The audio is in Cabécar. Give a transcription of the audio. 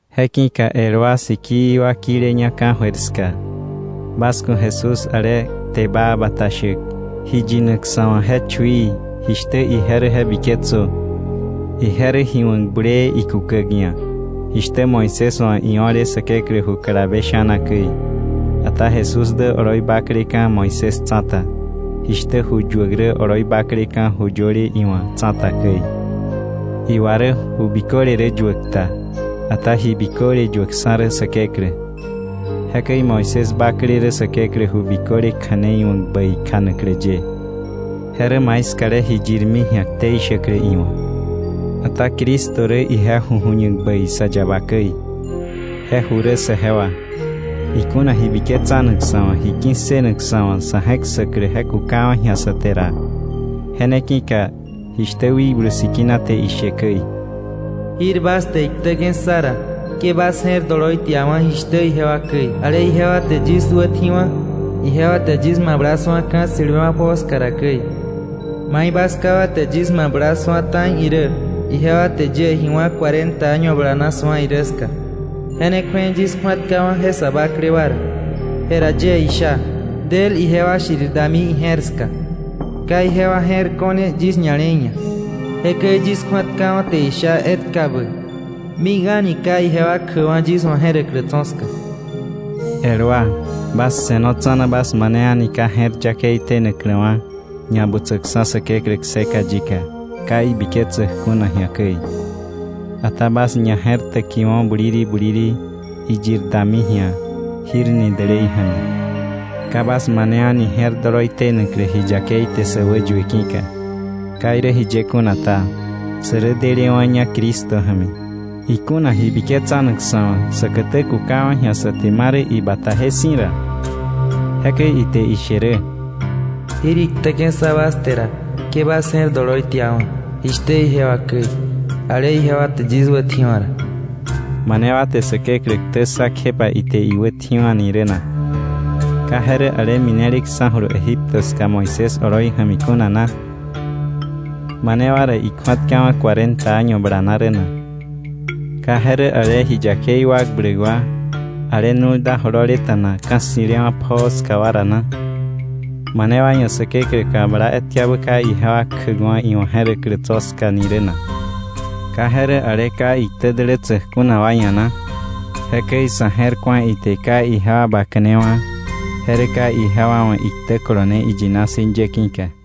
Je ki̱ka el wa sikii wa kileña ka̱jöir ska, bas ku̱ Jesús, ale kte baa bata shäk, ji yinak sa̱ wa̱ je chuií, jishtä ije rä je biketsö. Ije rä ji wa̱k bulee ikukäk ia̱, jishtä Moisés wa̱ io̱le Säkeklä ju kalabe sha̱na käi. Ata Jesús dä oloi bakleka̱ Moisés tsa̱ta, jishtä ju yuäk rä oloi bakleka̱ ju yöle iwa̱ tsa̱ta käi. Iwa rä ju biköle rä yuäk ta, ata ji biköle yuäkksa̱ rä Säkeklä. Jekäi Moisés bakle rä Säkeklä ju biköle kja̱nei wa̱k bäi kjanaklä ye. Je rä maiskale ji yirmi ji̱a ktei shäklä iwa̱. Ata Cristo rä ije ju ju̱ñak bäi sa yaba käi. Je ju rä saje wa, ikuna ji biketsanak sa̱ wa̱, ji ki̱ssënak sa̱ wa̱ sa̱ je̱k ssäklä je kukawa̱ ji̱a sä te ra. Je ne ki̱ka jishtä Wikblu Sikina te ishe käi: “Jir bas te iktäke̱ ssa ra, ke bas je̱r doloi tiawa̱ jishtä ijewa käi, ale ijewa te yis wätji̱wa̱, ijewa te yis mabla su̱a ka̱ ssi̱lewa̱ pjoo ska ra käi. Mai bas ká wa te yis mabla su̱a ta̱i irä, ijewa te yie ji wá̱ cuarenta año bala na su̱a irä ska. Je ne kju̱ei yis kju̱atkawa̱ je sa bakle wa ra. Jera yie isha: ‘Del ijewa shirir dami ije̱r ska. Ka ijewa je̱r ko̱ne yis ña̱le̱i ia̱.’ Jekäi yis kju̱atkawa̱ te isha etkabä: ‘Mik a̱ni ka ijewa kjäkwa̱ yis wa̱ je̱räklä tso̱ ska.’” El wa, bas se̱no tsa̱na bas mane a̱ni ka je̱r yakei tenakläwa̱ ñabutsäkksa̱ Säkeklä kseka yika ka ibiketsäk kuna ji̱a käi. Ata bas ñaje̱rtäkiwo̱ buliri buliri, iyir dami ji̱a “jir” ni dälei ja̱mi, ka bas mane a̱ni je̱r doloi tenaklä ji yakei te sä wäyue ki̱ka. Ka irä jiye kuna ta, sä rä delewa̱ña Cristo ja̱mi, ikuna ji biketsanak sa̱ wa̱ säkätä kukawa̱ ji̱a sa te marä ibataje si̱ ra. Jekäi ite she rä: “Jir iktäke̱ ssa bas te ra, ke bas je̱r doloi tiawa̱, jishtä ijewa käi, ale ijewa te yis wätji̱wa̱ ra.” ¿Mane wa te Säkeklä ktä ssa kjepa ite iwätji̱wa̱ ni rä na? ¿Ka je rä ale mineleksa̱julu Egipto ska Moisés oloi ja̱mi kuna na? ¿Mane wa ra ikju̱atkawa̱ cuarenta año bala na rä na? ¿Ka je rä ale ji yakei wakbläk wa, ale nu̱lda jololeta̱na ka̱ ssi̱lewa̱ pjoo ska wa ra na? ¿Mane wa ia̱ Säkeklä kabla etkabä ka ijewa kjäkwa̱ iwa̱ je̱räklä tso̱ ska ni rä na? ¿Ka je rä ale ka iktä dälätsäk kuna wa ia̱ na? Jekäi sa̱ je̱r ku̱a ite ka ijewa baka̱newa̱, je rä ka ijewa wa̱ iktä kolone iyina si̱ ye ki̱ka.